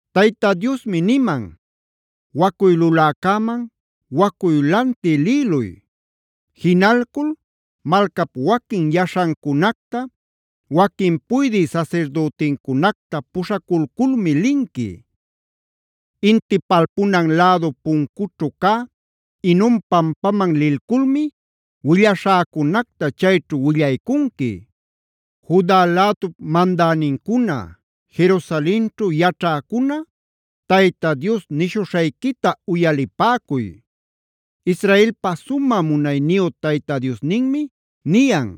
Tayta Diosmi niman: “Wacuy luläcäman, wacuy lantï lïluy. Jinalcul malcap waquin yaśhancunacta, waquin puydï sasirdüticunacta puśhaculculmi linqui. Inti palpunan lädu puncućhu cä Hinoma pampaman lilculmi willaśhäcunacta chayćhu willaycunqui: ‘Juda lädup mandänincuna, Jerusalenćhu yaćhäcuna Tayta Dios nishuśhayquita uyalipäcuy. Israelpa sumä munayniyu Tayta Diosninmi niyan: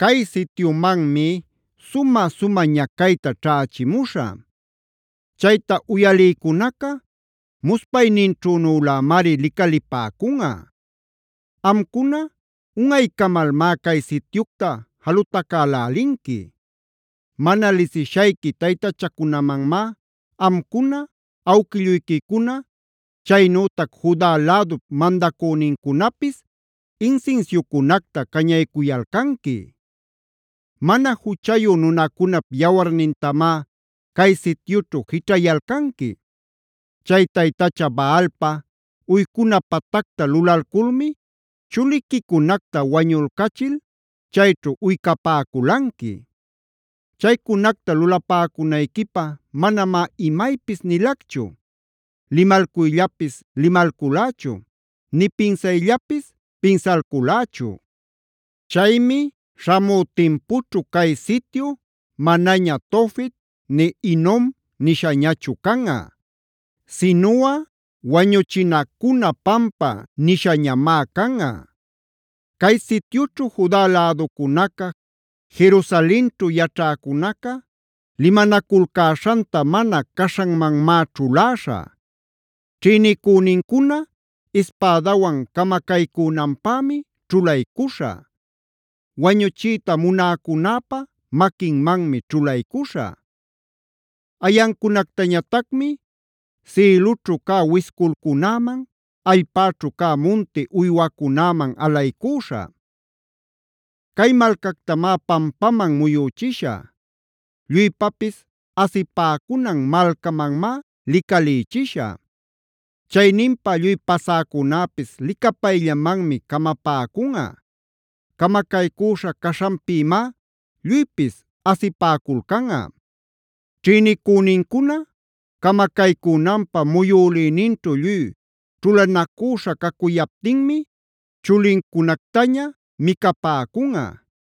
Cay sityumanmi sumä-sumä ñacayta ćhächimuśhä. Chayta uyalïcunaca muspayninćhünülämari licalipäcunꞌa. Amcuna, unꞌaycamalmá cay sityucta jalutacälälinqui. Mana lisishayqui taytachacunamanmá amcuna, awquilluyquicuna, chaynütac Juda lädup mandacünincunapis insinsiucunacta cañaycuyalcanqui. Mana juchayu nunacunap yawarnintamá cay sityućhu jićhayalcanqui. Chay taytacha Baalpab uycuna patacta lulalculmi chuliquicunacta wañulcachil chayćhu uycapäculanqui. Chaycunacta lulapäcunayquipä manamá imaypis nilacchu, limalcuyllapis limalculächu nï pinsayllapis pinsalculächu. Chaymi śhamü timpućhu cay sityu manaña Tofet, nï Hinom nishañachu canꞌa. Sinuꞌa Wañuchinacuna Pampa nishañamá canꞌa. “ ‘Cay sityućhu Juda läducunaca, Jerusalenćhu yaćhäcunaca limanaculcäśhanta mana caśhanmanmá ćhuläśhä. Ćhïnicünincuna ispädawan camacaycünanpämi ćhulaycuśhä; wañuchiyta munäcunäpä maquinmanmi ćhulaycuśhä. Ayancunactañatacmi sïlućhu cä wisculcunäman, allpäćhu cä munti uywacunäman alaycüśhä. Cay malcactamá pampaman muyüchishä; lluypapis asipäcunan malcamanmá licalïchishä. Chayninpa lluy pasäcunäpis licapayllamanmi camapäcunꞌa; camacaycüśha caśhanpïmá lluypis asipäculcanꞌa. Ćhïnicünincuna camacaycünanpä muyülïninćhu lluy ćhulanacüśha cacuyaptinmi chulincunactaña micapäcunꞌa,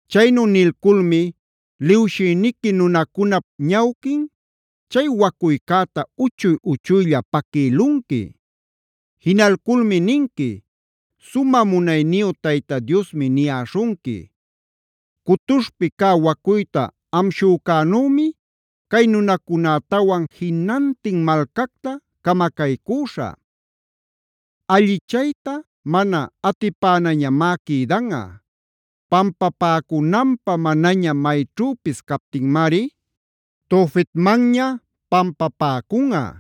“Chaynu nilculmi liwshïniqui nunacunap ñawquin chay wacuycäta uchuy-uchuylla paquïlunqui. Jinalculmi ninqui: Sumä munayniyu Tayta Diosmi niyäśhunqui: ‘Cutuśhpi cä wacuyta amshücänümi cay nunacunätawan jinantin malcacta camacaycüśhä; allichayta mana atipänañamá quïdanꞌa. Pampapäcunanpä manaña mayćhüpis captinmari Tofetmanña pampapäcunꞌa.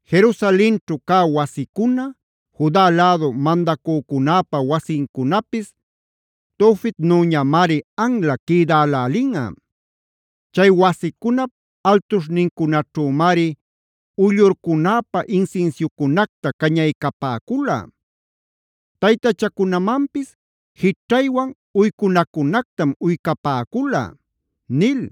Jerusalenćhu cä wasicuna, Juda lädu mandacücunäpa wasincunapis Tofetnüñamari anla quïdälälinꞌa. Chay wasicunap altuśhnincunaćhümari uyllurcunäpä insinsiucunacta cañaycapäcula; taytachacunamanpis jićhaywan uycunacunactam uycapäcula’” nil.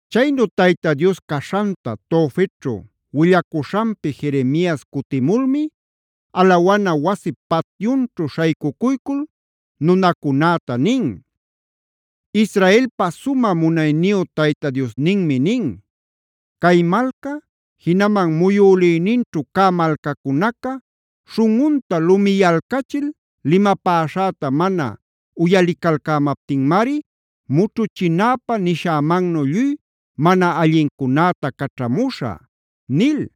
Chaynu Tayta Dios caćhaśhan Tofetćhu willacuśhanpi Jeremias cutimulmi alawana wasip patyunćhu śhaycucuycul nunacunäta nin: “Israelpa sumä munayniyu Tayta Diosninmi nin: ‘Cay malca, jinaman muyülïninćhu cä malcacunaca śhunꞌunta lumiyalcachil limapäśhäta mana uyalicalcämaptinmari mućhuchinäpä nishämannu lluy mana allincunäta caćhamuśhä’” nil.